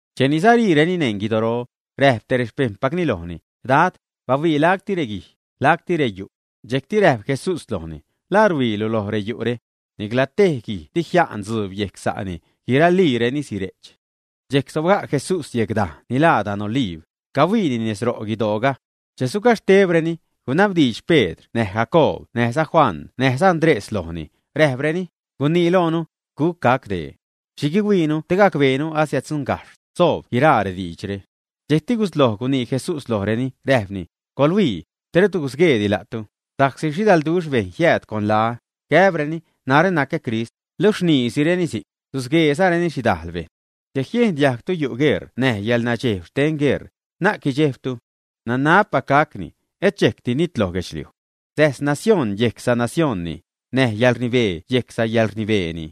Cheni sariireni neṉ guidoro, räjp tej rexpejṉpacni lojni: ―Dad, bahuii lacti reguij, lacti reyu'. Dxejcti räjp Jesús lojni: ―¿La rhuiilu loj reyu're? Nicla tej guij dijia'n dzuub yejc sa'ni, guiraliireni sire'ch. Dxejc sobga' Jesús yejc dajne' ni laa dan Oliib, cahuiini nez ro' guidooga. Che sugaxhtebreni, gunabdiidx Pedr näj Jacoob näjza Juan näjza Andrés lojni, räjpreni: ―Gunii loonu, ¿guc gac dee? ¿Xhi guihuiinu te gacbeenu asiäddzuṉgajxh soob guiraa rediidxre? Dxejcti gusloj gunii Jesús lojreni, räjpni: ―Coḻhuii, te rut gusgueedi la'tu, sa'csi xhidalduxh bejṉ jiääd con laä, gäbreni: “Narä nacä Crist”, luxh rniisireni si'c, susgueezareni xhidajl bejṉ. ’Che jiejn diajgtu yu' gueṟ näj yäḻnadxeeb xten gueṟ, na'c guidxejbtu. Nanabpac gacni; et dxejcdi nitloj guedxliuj. Säjs nacióṉ yejc sanacioṉni, näj yäḻrnibee yejc sayäḻrnibeeni.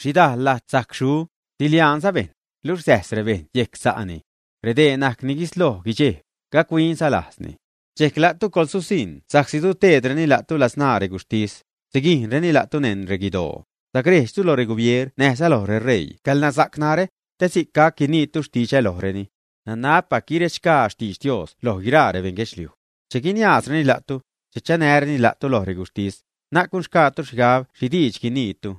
Xhidajl lajt sajc xu, siliaanza bejṉ, luxh säjs rebejṉ yejc sa'ni. Redee najc ni guisloj guidxejb, gachuinza lajzni. ’Dxejc la'tu coḻsusiṉ sa'csi suteedreni la'tu ladzṉaa reguxhtis, siguijnzareni la'tu neṉ reguidoo. Sacrejdxtu lo regubieer näjza loj reṟeii xcäḻnasa'c narä, te si'c gac guiniitu xtidxä lojreni. Nanabpac guirechxgaa xtidx Dios loj guiraa rebeṉ guedxliuj. Che guiniaazreni la'tu, che chanäreni la'tu loj reguxhtis, na'c gunxgaatu xhigab xhi diidx guiniitu.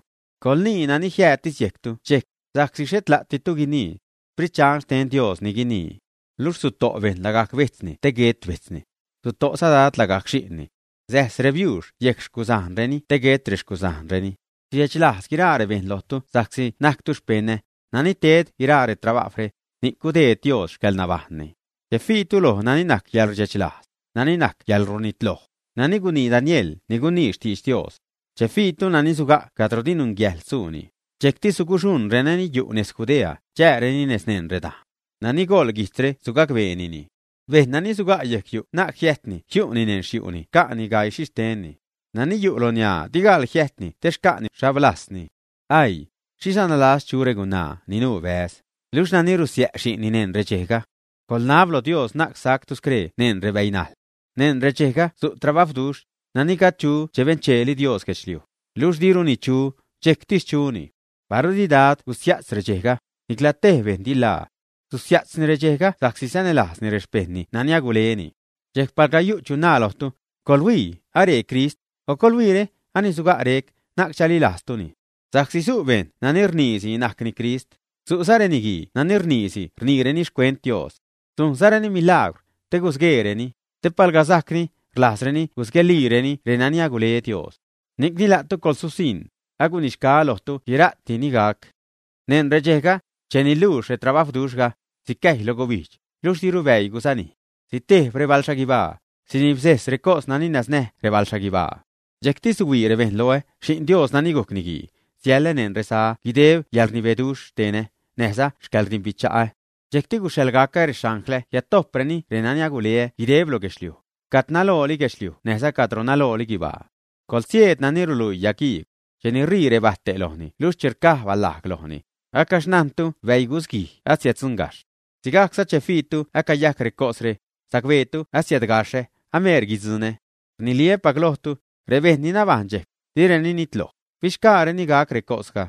Coḻnii nani jiäjttis yejctu dxejc, sa'csi xhet la'ditu ni guinii, Sprit Dxan xten Dios ni guinii. Luxh suto' bejṉ lagajc bejtzni te guet bejtzni. Suto'za dad lagajc xi'nni. Säjs rebiuux yejc rexcusajnni te guet reguzajnga. Sidxechlajz guiraa rebejṉ lojtu sa'csi najctu xpeṉä; nani ted guiraa retrabajwre, ni'c gudeed Dios xcäḻnabajṉni. ’Che fiitu loj nani najc yäḻrdxechlajz, nani najc yäḻrunitloj, nani gunii Daniel ni gunii xtidx Dios. Che fiitu nani suga' cadro di nunyäjḻ suuni, dxejcti suguxuṉ renani yu' nez Judea chääreni nez neṉ redajn. (Nani goḻ guijtzre sugacbeenini.) Bejṉ nani suga' yejc yu' na'c jiäjtni jiu'ni neṉ te yu' xca'ni gaii xhixtenni. Nani yu' loj ṉiaa, di gaḻ jiäjt te xca'ni xhablajzni. ¡Aii! Xhiza nalas chu regunaa ni nuu bäz, luxh renani rusiä' xi'nni, neṉ redxejga. Coḻnab loj Dios na'c sactu scree neṉ rebäinajḻ. Neṉ redxejga su' trabajwduxh, nani gajd chu che bencheeli Dios guedxliuj, luxh diruni chu, dxejctis chuni. Paru di Dad gusia'tz redxejga, nicla tej bejṉ di ḻaa. Susia'tzni redxejga sa'csi sanälajzni rexpejṉni nani aguleni. ’Dxejc palga yu' chu naa lojtu: “Coḻhuii, aree Crist”, o “Coḻhuiire, ani suga' rec”, na'c chalilajztuni. Sa'csi su' bejṉ nani rniisi najcni Crist. Su'za reniguii nani rniisi rniireni xcuent Dios. Sujnzareni milaagwr, te gusgueereni, te palga sajcni, rlajzreni gusgueelireni renani agule Dios. Ni'cni la'tu coḻsusiṉ; agunixgaä lojtu guira'ti ni gac. ’Neṉ redxejga, cheni luux retrabajwduxhga, sicäjy lo gubijdx, luxh diru bäii gusanij. Sitejb rebaḻxhaguibaa, sinibsejs recos nani nasnäj rebaḻxhaguibaa. Dxejcti suhuii rebejṉ loä, Xi'n Dios nani gujc Niguii, siälä neṉ reza guideb yäḻrnibeduxh xtenä, näjza xcäḻdimbicha'ä. Dxejcti guxhaḻgacä rexanglä jiädtojpreni renani guleä guideb lo guedxliuj, cat nalooli guedxliuj näjza cadro nalooli guibaa. ’Coḻguisieed nani ruluii yagiigw. Cheni rii rebäte' lojni luxh che rcaj balajg lojni, acaxhnajntu bäii gusguij asadzuṉgajxh. Sigajcza, che fiitu acayajc recosre, sacbeetu asiädgaxhä, ameer guidzuṉä. Rniliä́pac lojtu, rebejṉ ni nabajṉ dxejc, direni nitloj, fixgaareni gac recosga.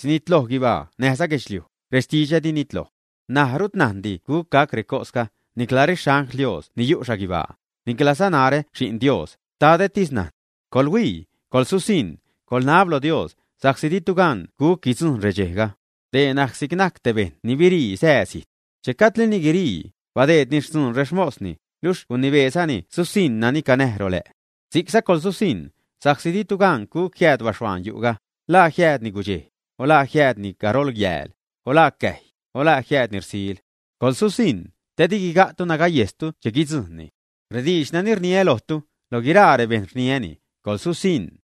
Sinitloj guibaa näjza guedxliuj, rextidxä di nitloj. ’N̲aj, rut najndi guc gac recosga, nicla rexangl Dios ni yu' xhaguibaa, niclaza narä Xi'n Dios, Xtadätis najn. ’Coḻhuii, coḻsusiṉ, coḻnab loj Dios, sa'csi ditu gan guc guidzujṉ redxejga. Dee najc si'c najc te bejṉ ni birii sää zijt. Che gajdlini guirii, badeedni xtzun rexmosni, luxh gunibeezani susiṉ nani canäj rolä'. Si'cza coḻsusiṉ, sa'csi ditu gan guc jiääd baxhuaan yu'ga, la jiäädni gudxej, o la jiäädni garol yääl, o la cäjy, o la jiäädni ṟsil. Coḻsusiṉ, te di guiga'tu nagayejstu che guidzujṉni. Rediidx nani rniä lojtu, loj guiraa rebejṉ rniäni: coḻsusiṉ.